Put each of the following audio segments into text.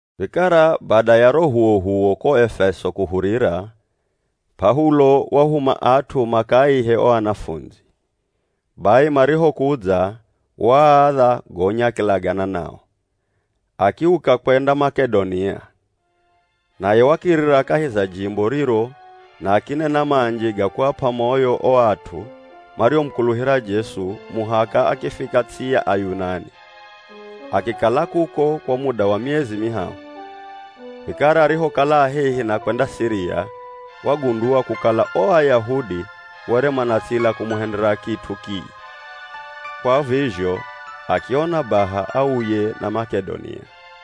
Vikara bada ya ro h'uwoh'uwo ko Efeso kuhurira, P'aulo wahuma at'u makaaihe o anafundzi. Bai marihokudza, waaadha gonya akilagana nao, akiuka kwenda Mak'edonia. Naye wakirira kahi za jimbo riro na akinena manji ga kuap'a moyo o at'u mariomukuluhira Jesu muhaka akifika ts'i ya Ayunani. Akikala kuko kwa muda wa miezi mihahu. Vikara arihokala a hehi na kwenda Siria, wagundua kukala o Ayahudi were manatsila kumuhendera kit'u kii, kwa vizho akiona baha auye na Mak'edonia.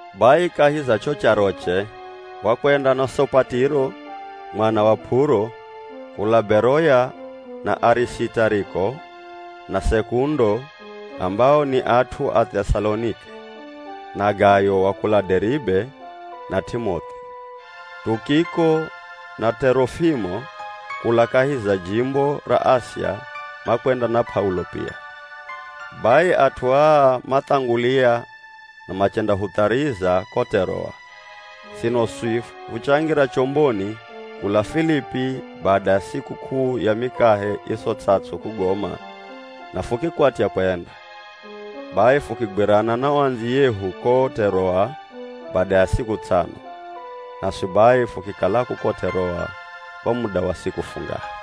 Bai kahi za cho charoche, wakwenda na Sopatiro mwana wa P'uro kula Beroya na Arisitariko na Sekundo ambao ni at'u a Th'esalonike, na Gayo wa kula Deribe na T'imoth'i. Tukiko na T'erofimo, kula kahi za jimbo ra Asia makwenda na P'aulo pia. Bai at'u aa mathangulia na machendahuthariza ko T'eroa. Sino swi fuchangira chomboni kula Filipi bada ya sikuk'uu ya Mikahe Iso Ts'ats'u kugoma na fukikwatya kwenda. Bai fukigwirana na o andziyehu ko T'eroa bada ya siku ts'ano, naswi bai fukikala kuko T'eroa kwa muda wa siku fungahe.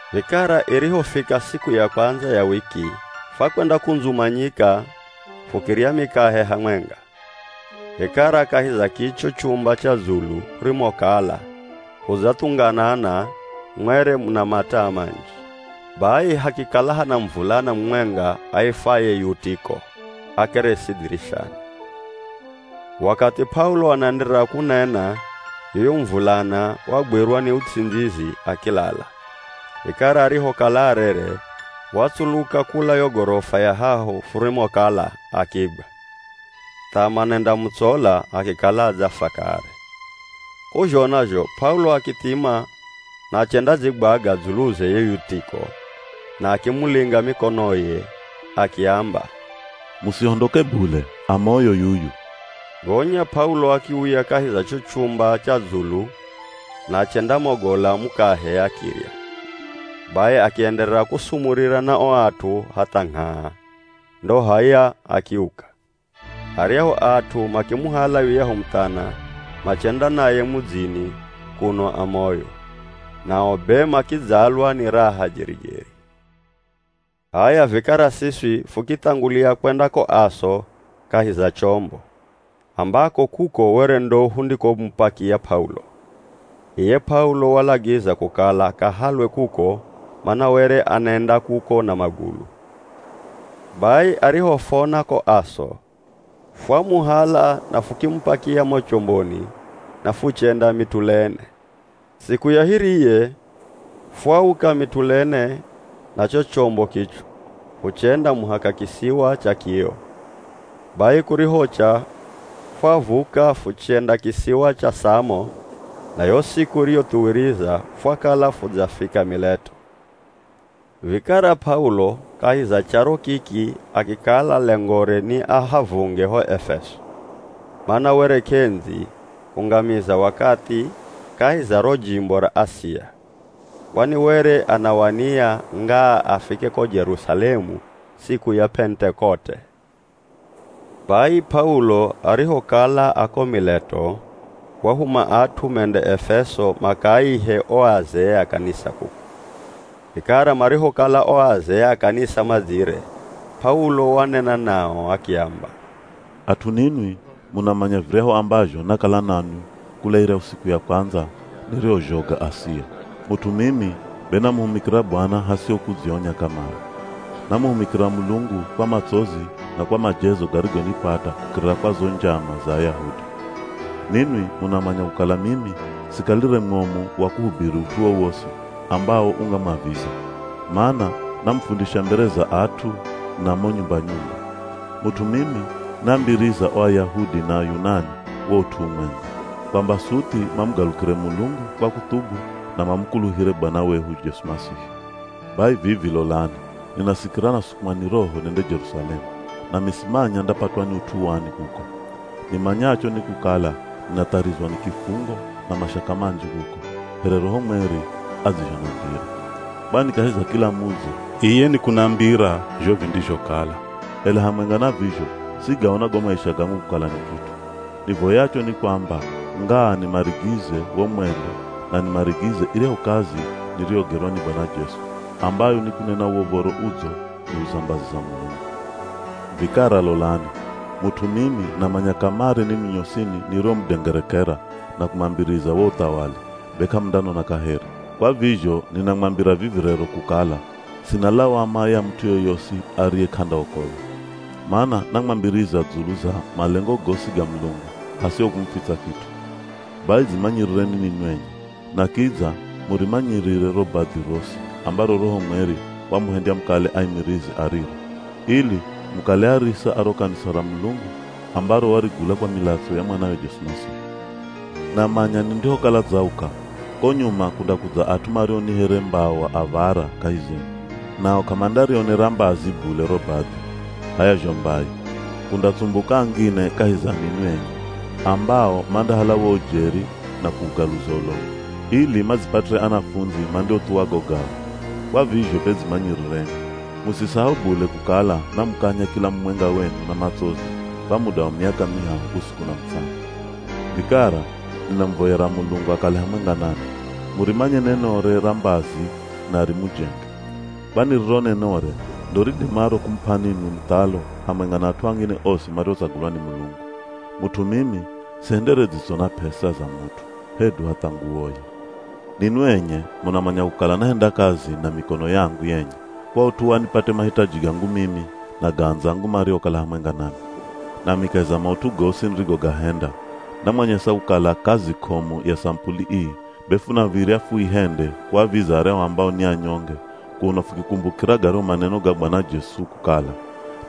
Vikara irihofika siku ya kwandza ya wiki, fwakwendakundzumanyika fukirya mikahe hamwenga. Vikara kahi za kicho chumba cha dzulu hurimokala hudzathunganana mwere muna mataa manji. Bai hakikala hana muvulana mumwenga aifwaye Yutiko akeresi dhirishani. Wakathi P'aulo anaenderera kunena, yuyu muvulana wagwirwa ni uts'indzizi akilala. Vikara arihokala arere, watsuluka kula yo gorofa ya hahu furimokala akigwa, tha manendamutsola akikala adzafwa kare. K'uzhona zho P'aulo akithima na achendadzigwaga dzuluze ye Yutiko na akimulinga mikonoye akiamba, “Musihondoke bule, a moyo yuyu!” Gonya P'aulo akiuya kahi za cho chumba cha dzulu na achendamogola mukahe akirya. Bai akienderera kusumurira na o at'u hatha ngh'aa, ndo h'aya, akiuka. Aryahu at'u makimuhala yuyahu muthana machenda naye mudzini kuno a moyo, nao be makidzalwa ni raha jeri-jeri. H'aya vikara siswi fukithangulia kwenda ko Aso kahi za chombo, ambako kuko were ndo hundikomupakia P'aulo. Iye P'aulo walagiza kukala akahalwe kuko mana were anenda kuko na magulu. Bai arihofona ko Aso, fwamuhala na fukimupakia mo chomboni na fuchenda Mitulene. Siku ya hiriye, fwauka Mitulene na cho chombo kicho, fuchenda muhaka kisiwa cha Kio. Bai kurihocha fwavuka fuchenda kisiwa cha Samo, na yo siku iriyothuwiriza fwakala fudzafika Mileto. Vikara P'aulo kahi za charo kiki akikala lengore ni ahavunge ho Efeso, mana were k'endzi kungamiza wakathi kahi za ro jimbo ra Asia, kwani were anawania, ngaa afike ko Jerusalemu siku ya Pentekote. Bai P'aulo arihokala a ko Mileto, wahuma at'u mende Efeso makaaihe o azee a kanisa kuko. Vikara marihokala o azee a kanisa madzire, P'aulo wanena nao akiamba, “At'u ninwi munamanya viryahu ambazho nakala nanwi kula iryahu siku ya kwandza nirihozhoga Asia. Mut'u mimi be namuhumikira Bwana hasiho kudzionya kamare. Namuhumikira Mulungu kwa matsozi na kwa majezo garigonipata kukirira kwa zo njama za Ayahudi. Ninwi munamanya kukala mimi sikalire mwomu wa kuhubiri ut'u wowosi ambawo ungamwaviza, mana namufundisha mbere za at'u na mo nyumba-nyumba. Mut'u mimi naambiriza o Ayahudi na Ayunani wo ut'u umwenga, kwamba suthi mamugalukire Mulungu kwa kuthubu na mamukuluhire Bwana wehu Jesu Masihi. Bai vivi lolani ninasikira nasukumwa ni Roho nende Jerusalemu, nami simanya ndapatwa ni ut'u wani kuko. Nimanyacho ni kukala ninatharizwa ni kifungo na mashaka manji kuko, here Roho Mweri adzizhonambira. Kwani kahi za kila mudzi iye nikunambira zho vindizhokala. Ela hamwenga na vizho sigaona go maisha gangu kukala ni kit'u. Nivoyacho ni kwamba ngaa nimarigize wo mwendo na nimarigize iryahu kazi niriyogerwa ni Bwana Jesu, ambayo ni kunena wo Uv̱oro Udzo dzulu za mbazi za Mulungu. “Vikara lolani, mut'u mimi namanya kamare ninwi nyosini niriomudengerekera na kumwambiriza wo uthawali, be k'amundanona kaheri. Kwa vizho ninamwambira vivi rero kukala sina lawama ya mut'u yoyosi ariye k'andaokolwa. Mana namwambiriza dzulu za malengo gosi ga Mulungu hasiho kumufitsa kit'u. Bai dzimanyirireni ninwi enye, na kidza murimanyirire ro badhi rosi ambaro Roho Mweri wamuhendya mukale aimirizi a riro, ili mukale arisa a ro kanisa ra Mulungu ambaro warigula kwa milatso ya mwanawe Jesu Masihi. Namanya nindihokala dzauka, ko nyuma kundakudza at'u mario ni here mbawa av̱ara kahi zenu, nao k'amandarionera mbazi bule ro badhi. H'aya zho mbai, kundatsumbuka angine kahi za ninwi enye, ambao mandahala wo ujeri na kuugaluza ulongo, ili madzipatire anafundzi mandiothuwa go gao. Kwa vizho be dzimanyirireni! Musisahau bule kukala namukanya kila mumwenga wenu na matsozi kwa muda wa miaka mihahu usiku na mutsana. “Vikara, ninamuvoyera Mulungu akale hamwenga nanwi, murimanye nenore ra mbazi na rimujenge. Kwani riro nenore ndo ridimaro kumup'a ninwi muthalo hamwenga na at'u angine osi mariotsagulwa ni Mulungu. Mut'u mimi sihendere dzitso na p'esa za mut'u, hedu hatha nguwoye. Ninwi enye munamanya kukala nahenda kazi na mikono yangu yenye kwa ut'u wa nipate mahitaji gangu mimi na ga andzangu mariokala hamwenga nami. Nami kahi za maut'u gosi nirigogahenda, namwanyesa kukala kazi k'omu ya samupuli ii be funav̱irya fuihende kuaviza aryahu ambao ni anyonge kuno fukikumbukira garyahu maneno ga Bwana Jesu kukala,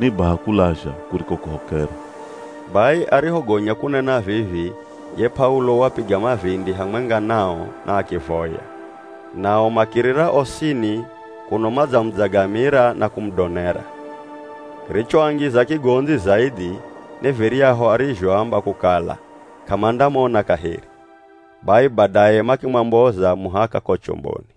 ‘Ni baha kulazha kuriko kuhokera.’” Bai arihogonya kunena vivi ye P'aulo wapiga mavindi hamwenga nao na akivoya. Nao makirira osini kuno manamudzagamira na kumudonera. Kirichoangiza kigondzi zaidhi ni viryahu arizhoamba kukala k'amandamona kaheri. Bai badaye makimwamboza muhaka ko chomboni.